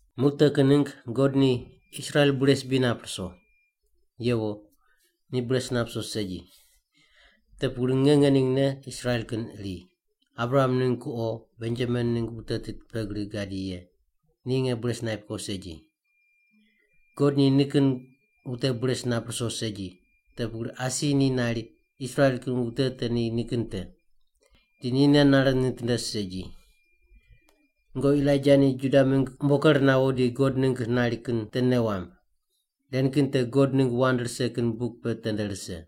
Muq te kin ningg God ni Israel bures bri nap ruso? Yewo, ni bures nap ruso segi. Te pugri nge ngeningne Israel kin iri, Abraham ningg kuqo Benjamin ningg wute tit pe gri gadi ye, ni nge bures naip ko segi. God ni nikin wute bures nap ruso segi, te pugri asi ni nari Israel kin wute te ni nikin te. Di ni nei nare nitinde segi. Nungoqi Elaija ni Juda mingg umbo ker nawo di God ningg nari kin te nei wamb. Ren kin te God ningg wand rise kin buk pe tende rise.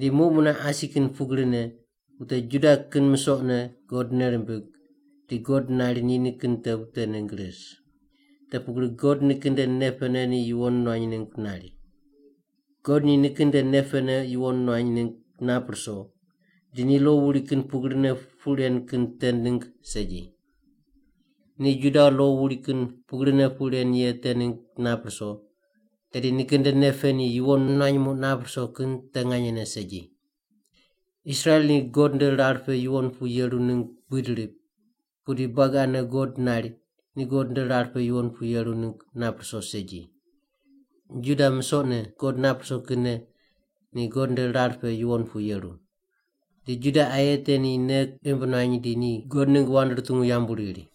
Di muq mune asi kin pugrine wute Juda kin misoqne God nei rimbig di God nari ni nikin te wute ningg ris. Te pugri God nikin nde nei pene ni yuwon nuany ningg nari. God ni nikin nde nei pene yuwon nuany ningg nap ruso, di ni lo wuri kin pugrine puq ren kin te ningg segi. Ni Juda lo wuri kin pugrine puq ren ye te ningg nap ruso, tedi nikin nde nei pe ni yuwon nuany muq nap ruso kin te nganyene segi. Israel ni God nde rar pe yuwon pu yeru ningg buid rip, pudi buagi ane God nari ni God nde rar pe yuwon pu yeru ningg nap ruso segi. Juda musoqne God nap ruso kinne ni God nde rar pe yuwon pu yeru. Di Juda aye te ni nei imb nuany di ni God ningg wand rutungu yambu riri.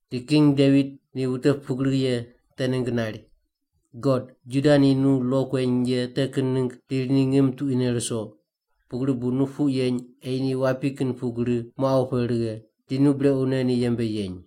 Di king Devit ni wute pugri ye te ningg nari, “God, Juda ni nu lo kueny ye te kin ningg riri ni ngim tuquine ruso, pugri bu nu puq yeny ei ni wapi kin pugri moqaw pe righe, di nu brequne ni yembe yeny.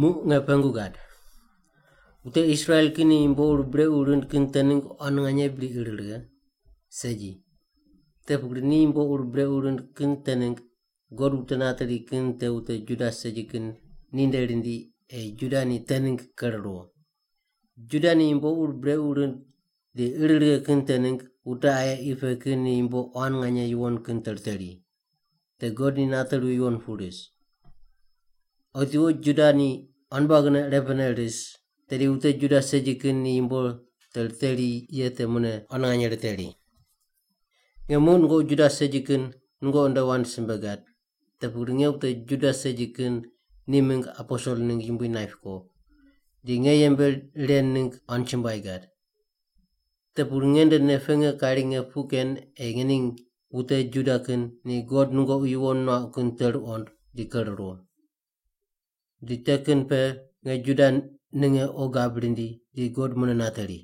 Muq nge pengu gad: wute Israel kin ni yumbo ur brequ rind kin te ningg quan nganye bri ir righe? Segi! Te pugri ni yumbo ur brequ rind kin te ningg God wute nateri kin te wute Juda segi kin ninde rindi ei Juda ni te ningg ker ruwo. Juda ni yumbo ur brequ rind di ir righe kin te ningg wute aye qi pe kin ni yumbo quan nganye yuwon kin te riteri, te God ni nateri yuwon pu ris. Otiwo Juda ni quan buagine irepene ris, tedi wute Juda segi kin ni yumbo te riteri ye te mune quan nganye riteri. Nge muq nungoqi Juda segi kin nungoqi nde wand simbe gad, te pugri nge wute Juda segi kin ni mingg aposel ningg Yumbui naip ko, di nge yembe ren ningg quan chumbuai gad. Te pugri nge nde nei pe nge kari nge puq ken ei ngening wute Juda kin ni God nungoqi yuwon nuauq kin te ruqond di ker ruwo. Di te kin pe nge Juda ninge qo gab rindi di God mune nateri.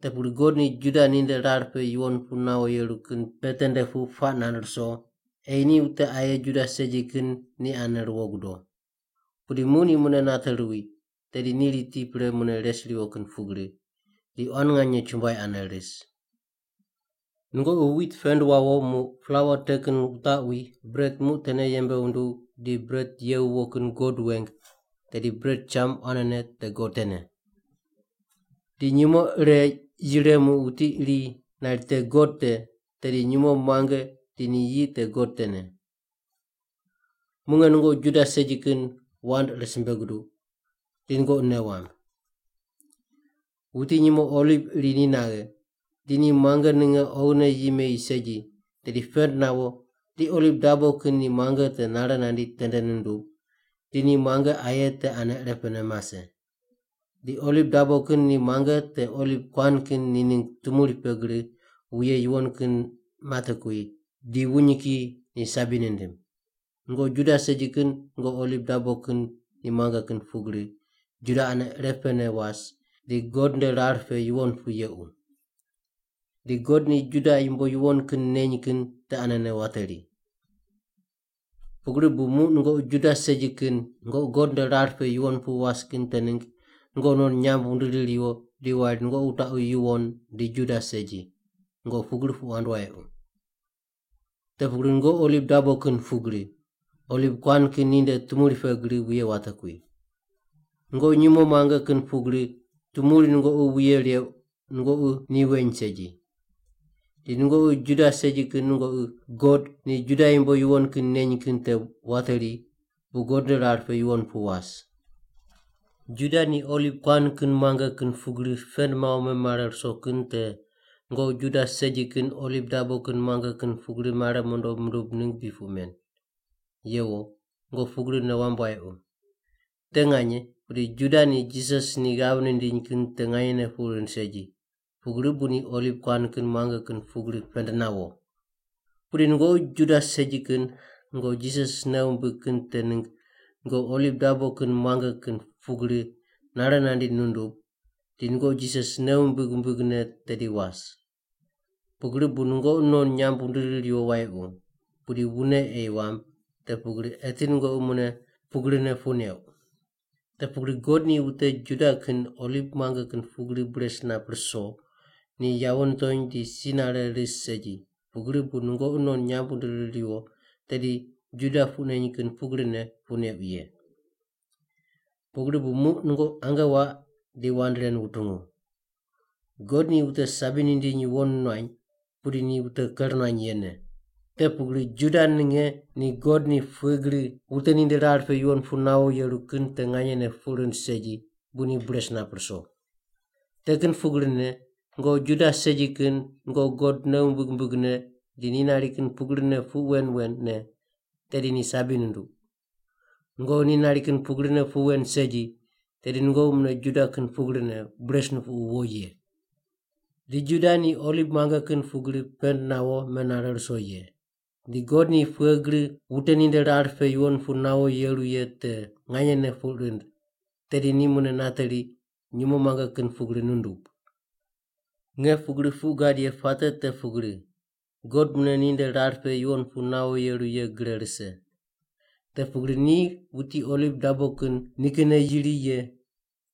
Te pugri God ni Juda ninde rar pe yuwon pu nawo yeru kin pe tende pu puaq nand ruso ei ni wute aye Juda segi kin ni ane ruwo gudo. Pudi muq ni mune nate ruwi, tedi ni riti pre mune res riwo kin pugri, di quan nganye chumbuai ane ris. Nungoqi wit pend wawo muq plaua te kin wutaqwi bret muq tene yembe wunduw di bret ye wuwo kin God weng, tedi bret cham quanene te God tene. Di nyumo ire yire muq wuti ni nari te God te, tedi nyumo muange di ni yi te God tene. Muq nge nungoqi Juda segi kin wand ire simbe guduq, di nungoqi nei wamb. Wuti nyumo oliv iri ni naghe, di ni muange ninge oghine yi meyi segi, tedi pend nawo di oliv dabo kin ni muange te nare nandi tende nundub di ni muange aye te ane irepene mase. Di oliv dabo kin ni muange te oliv kuan kin ni ningg tumuri pe gri wuye yuwon kin matekui, di wuny kiyi ni sabi nindim. Nungoqi Juda segi kin nungoqi oliv dabo kin ni muange kin pugri Juda ane irepene was di God nde rar pe yuwon pu yequ. Di God ni Juda yumbo yuwon kin neny kin te anene wateri. Pugri bu muq nungoqi Juda segi kin nungoqi God nde rar pe yuwon pu was kin te ningg nungoqi non nyamb wundiri riwo di wari nungoqi wutaqu yuwon di Juda segi. Nungoqi pugri puq wand wayequ. Te pugri nungoqi oliv dabo kin pugri, oliv kuan kin ni nde tumuri pe gri wuye watekui. Nungoqi nyumo muange kin pugri tumuri nungoqi wuye reuq, nungoqi ni weny segi. Di nungoqi Juda segi kin nungoqi God ni Juda yumbo yuwon kin neny kin te wateri bu God nde rar pe yuwon pu was. Juda ni oliv kuan kin muange kin pugri pend mawo memare ruso kin te nungoqi Juda segi kin oliv dabo kin muange kin pugri mare mondo mundub ningg bri puq men? Yewo, nungoqi pugri nei wamb wayequ. Te nganye, pudi Juda ni Jisas ni ghav nindiny kin te nganyene puq rind segi, pugri bu ni oliv kuan kin muange kin pugri pend nawo. Pudi nungoqi Juda segi kin nungoqi Jisas nei wumbig kin te ningg nungoqi oliv dabo kin muange kin pugri nare nandi nundub, di nungoqi Jisas nei wumbig wumbigne tedi was. Pugri bu nungoqi non nyamb wundiri riwo wayequ, pudi wune ei wamb, te pugri eti nungoqi mune pugrine puq neuq. Te pugri God ni wute Juda kin oliv muange kin pugri bures nap ruso, ni yawo nitony di si nare ris segi, pugri bu nungoqi non nyamb wundiri riwo, tedi Juda puq neny kin pugrine puq neuq ye. Pugri bu muq nungoqi ange waq di wand ren wutungu. God ni wute sabi nindiny yuwon nuany, pudi ni wute ker nuany yene. Te pugri Juda ninge ni God ni pughe gri wute ninde rar pe yuwon pu nawo yeru kin te nganyene puq rind segi bu ni bures nap ruso. Te kin pugrine, nungoqi Juda segi kin nungoqi God nei wumbig wumbigne di ni nari kin pugrine puq wen wen ne, tedi ni sabi nunduq. Nungoqi ni nari kin pugrine puq wen segi tedi nungoqi mune Juda kin pugrine bures nupuqu wo ye. Di Juda ni oliv muange kin pugri pend nawo menare ruso ye, di God ni pughe gri wute ninde rar pe yuwon pu nawo yeru ye te nganyene puq rind, tedi ni mune nateri nyumo muange kin pugri nundub. Nge pugri puq gad ye puate te pugri, God mune ninde rar pe yuwon pu nawo yeru ye gre rise. Te pugri ni wuti oliv dabo kin nikinne yiri ye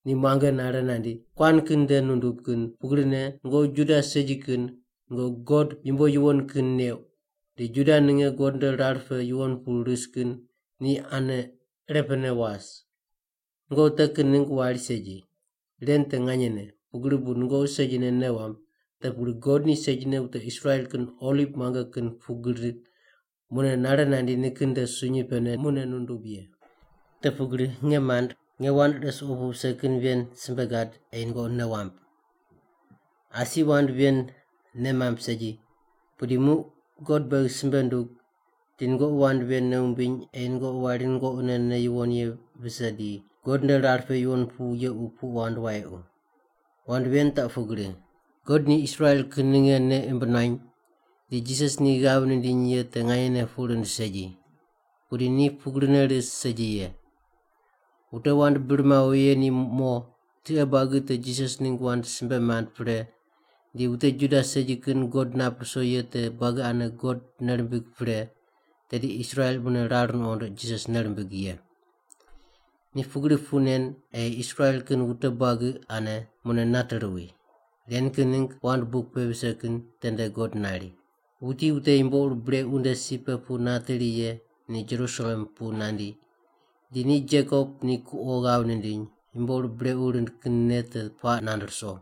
ni muange nare nandi kuan kin nde nundub kin pugrine nungoqi Juda segi kin nungoqi God yumbo yuwon kin neuq, di Juda ninge God nde rar pe yuwon pu ris kin ni ane irepene was. Nungoqi te kin ningg wari segi. Ren te nganyene, pugri bu nungoqi segine nei wamb, te pugri God ni segine wute Israel kin oliv muange kin pugri mune nare nandi nikin nde sunyi pene mune nundub ye. Te pugri, nge mand, nge wand ire suqo pu vise kin ven simbe gad ei nungoqi nei wamb. Asi wand ven nei mamb segi, pudi muq God beghi simbe ndug di nungoqi wand ven nei wumbiny ei nungoqi wari nungoqine nei yuwon ye vise di God nde rar pe yuwon pu yequ puq wand wayequ. Wand ven taq pugri: God ni Israel kin ninge nei imb nuany di Jisas ni ghav nindiny ye te nganyene puq rind segi. Pudi ni pugrine ris segi ye. Wute wand bir mawo ye ni mo tiqe buagi te Jisas ningg wand simbe mand pre di wute Juda segi kin God nap ruso ye te buagi ane God nei rimbig pre, tedi Israel mune rar nuqond Jisas nei rimbig ye. Ni pugri puq nen ei Israel kin wute buagi ane mune nate ruwi. Ren kin ningg wand buk pe vise kin tende God nari, “Wuti wute yumbo ur brequ nde si pe pu nateri ye ni Jerusalem pu nandi, di ni Jekop ni kuqo ghav nindiny yumbo ur brequ rind kin nei te puaq nand ruso.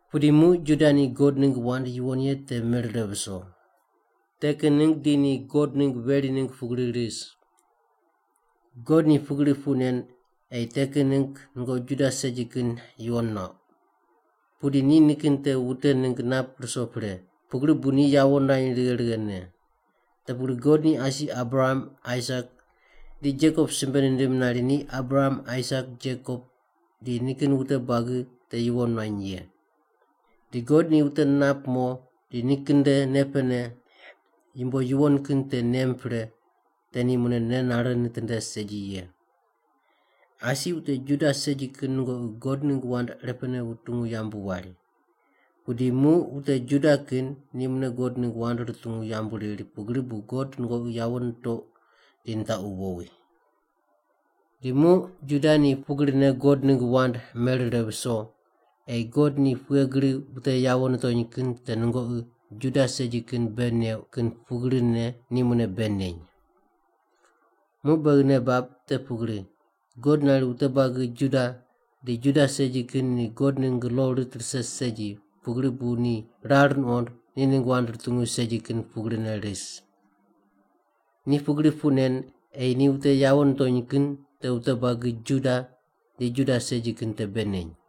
Pudi muq Juda ni God ningg wand yuwon ye te merire viso. Te kin ningg di ni God ningg veri ningg pugri ris. God ni pugri puq nen ei te kin ningg nungoqi Juda segi kin yuwon nuauq. Pudi ni nikin te wute ningg nap ruso pre, pugri bu ni yawo nirany righe righene. Te pugri God ni asi Abraham, Aisak di Jekob simbe nindim nari ni Abraham, Aisak, Jekob di nikin wute buagi te yuwon nuany ye. Di God ni wute nap mo di nikin nde nei pene yumbo yuwon kin te nem pre, te ni mune nei nare nitinde segi ye. Asi wute Juda segi kin nungoqi God ningg wand irepene wutungu yambu wari. Pudi muq wute Juda kin ni mune God ningg wand rutungu yambu riri pugri bu God nungoqi yawo nitoqu di nitaqu wowi. Di muq Juda ni pugrine God ningg wand merire viso ei God ni pughe gri wute yawo nitony kin te nungoqi Juda segi kin bei neuq kin pugrine ni mune bei neny. Muq beghi nei bab te pugri, God nari wute buagi Juda di Juda segi kin ni God ningg lo rit rise segi pugri bu ni rar nuqond ni ningg wand rutungu segi kin pugrine ris. Ni pugri puq nen ei ni wute yawo nitony kin te wute buagi Juda di Juda segi kin te bei neny.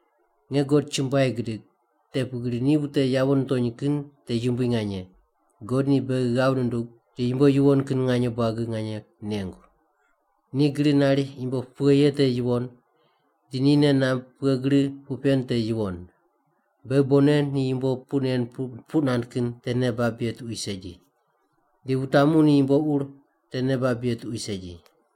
Nge God chumbuai gidig, te pugri ni wute yawo nitony kin te yumbui nganye. God ni beghi ghav nundug di yumbo yuwon kin nganye buagi nganye nengu. Ni gri nari yumbo pughe ye te yuwon, di ni nei namb pughe gri puq pen te yuwon. Beghi bonne ni yumbo puq nen puq nand kin te nei bab ye tuqui segi. Di wutamu ni yumbo ur te nei bab ye tuqui segi.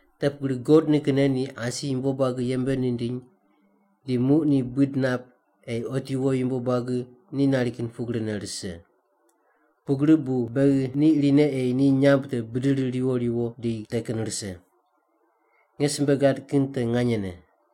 Te pugri God nikinne ni asi yumbo buagi yembe nindiny, di muq ni buid nap ei otiwo yumbo buagi ni nari kin pugrine rise. Pugri bu beghi ni irine ei ni nyamb te bidiri riwo riwo di te kin rise. Nge simbe gad kin te nganyene.